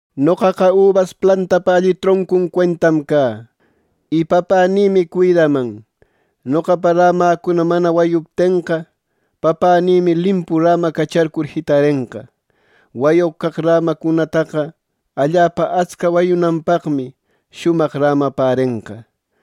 “Noqaqa ubas plantapa alli troncu cuentam cä. Y Papänïmi cuidaman. Noqapa rämäcuna mana wayuptenqa, Papänïmi limpu rämacacharcur jitarenqa. Wayoq caq rämacunataqa allapa atsca wayünanpaqmi shumaq rämapärenqa.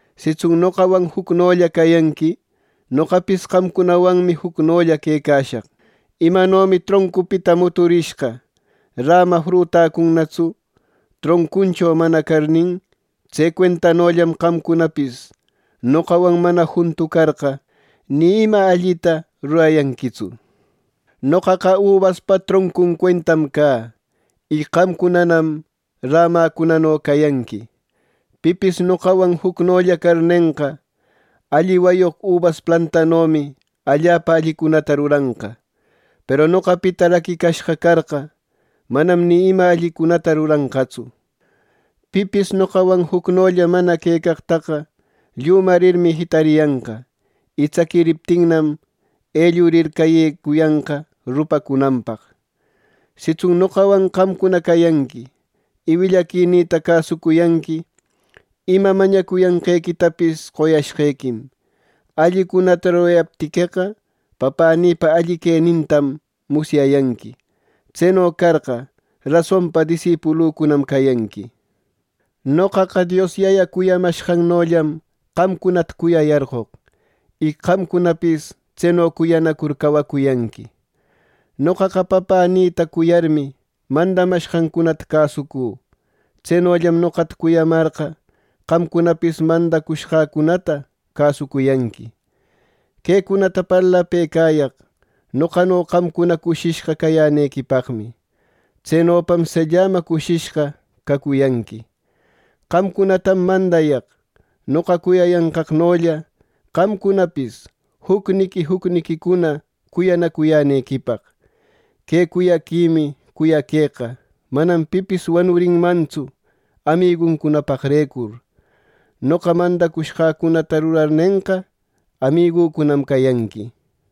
Sitsun noqawan jucnolla cayanqui, noqapis qamcunawanmi jucnolla quecashaq. Imanomi troncunpita muturishqa räma frutacunnatsu, troncuncho manana carnin; tse cuentanollam qamcunapis noqawan mana juntu carqa, ni ima allita rurayanquitsu. “Noqaqa ubaspa troncun cuentam cä. Y qamcunanam ramäcunano cayanqui. Pipis noqawan jucnolla carnenqa, alli wayoq ubas plantanomi allapa allicunata ruranqa; peru noqapita raquicashqa carqa, manam ni ima allicunata ruranqatsu. Pipis noqawan jucnolla mana quecaqtaqa llümarir jitariyanqa, y tsaquiriptinnam, ellurir cayecuyanqa rupacunanpaq. “Sitsun noqawan qamcuna cayanqui y willaquinïta cäsucuyanqui, ima mañacuyanqequitapis qoyashqequim. Allicunata rurayaptiqueqa, Papänïpa alli quenintam musyayanqui. Tseno carqa, rasonpa disipulücunam cayanqui. Noqaqa Dios Yaya cuyamashqannollam qamcunata cuyayarqoq. Y qamcunapis tseno cuyanacur cawacuyanqui. Noqaqa Papänïta cuyarmi, mandacushqancunata cäsucü. Tsenollam noqata cuyamarqa, qamcunapis mandacushqäcunata cäsucuyanqui. “Quecunata parlapëcayaq noqano qamcuna cushishqa cayänequipaqmi. Tsenopam sellama cushishqa cacuyanqui. Qamcunatam mandayaq: Noqa cuyayanqaqnolla qamcunapis jucniqui jucniquicuna cuyanacuyänequipaq. Que cuyaquimi cuyaqueqa manam pipis wanurinmantsu amiguncunapaqrecur. Noqa mandacushqäcunata rurarnenqa, amigücunam cayanqui.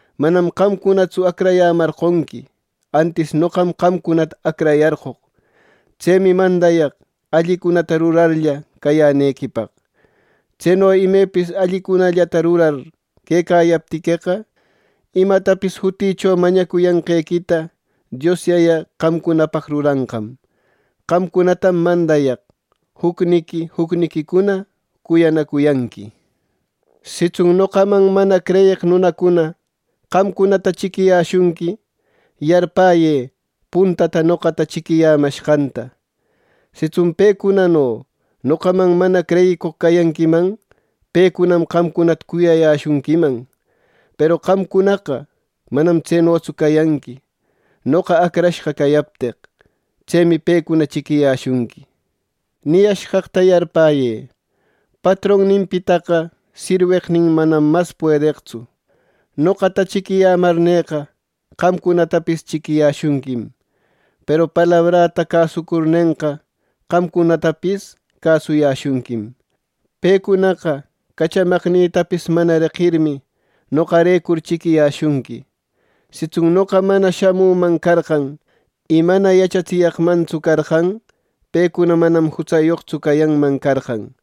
Manam qamcunatsu acrayämarqonqui, antis noqam qamcunata acrayarqoq. Tsemi mandayaq allicunata rurarlla cayänequipaq. Tseno imepis allicunallata rurar quecayaptiqueqa, imatapis jutïcho mañacuyanqequita Dios Yaya qamcunapaq ruranqam. Qamcunatam mandayaq: Jucniqui jucniquicuna cuyanacuyanqui” nir. “Sitsun noqaman mana creyeq nunacuna qamcunata chiquiyäshunqui; yarpäyë puntata noqata chiquiyämashqanta. Sitsun pecunano noqaman mana creyicoq cayanquiman, pecunam qamcunata cuyayäshunquiman. Peru qamcunaqa manam tsenotsu cayanqui, noqa acrashqa cayapteq. Tsemi pecuna chiquiyäshunqui. Niyashqaqta yarpäyë: ‘Patronninpitaqa sirweqnin manam mas puedeqtsu.’ Noqata chiquiyämarneqa, qamcunatapis chiquiyäshunquim. Peru palabräta cäsucurnenqa, qamcunatapis cäsuyäshunquim. Pecunaqa cachamaqnïtapis mana reqirmi, noqarecur chiquiyäshunqui. “Sitsun noqa mana shamüman carqan y mana yachatsiyaqmantsu carqan, pecuna manam jutsayoqtsu cayanman carqan.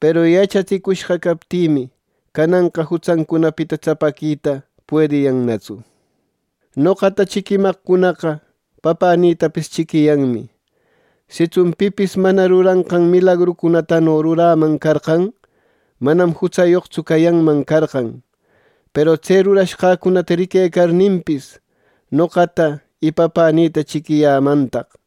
Peru yachatsicushqa captïmi, cananqa jutsancunapita tsapäquita puediyannatsu. Noqata chiquimaqcunaqa Papänïtapis chiquiyanmi. Sitsun pipis mana ruranqan milagrucunatano ruräman carqan, manam jutsayoqtsu cayanman carqan. Peru tse rurashqäcunata riquecarninpis, noqata y Papänïta chiquiyämantaq.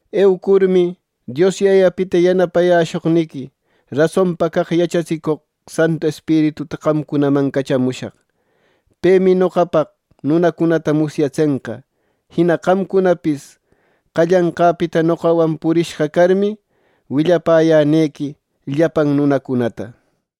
“Eucurmi, Dios Yayapita yanapayäshoqniqui rasonpa caq yachatsicoq Santu Espirituta qamcunaman cachamushaq. Pemi noqapaq nunacunata musyatsenqa. Jina qamcunapis qallanqäpita noqawan purishqa carmi, willapäyänequi llapan nunacunata.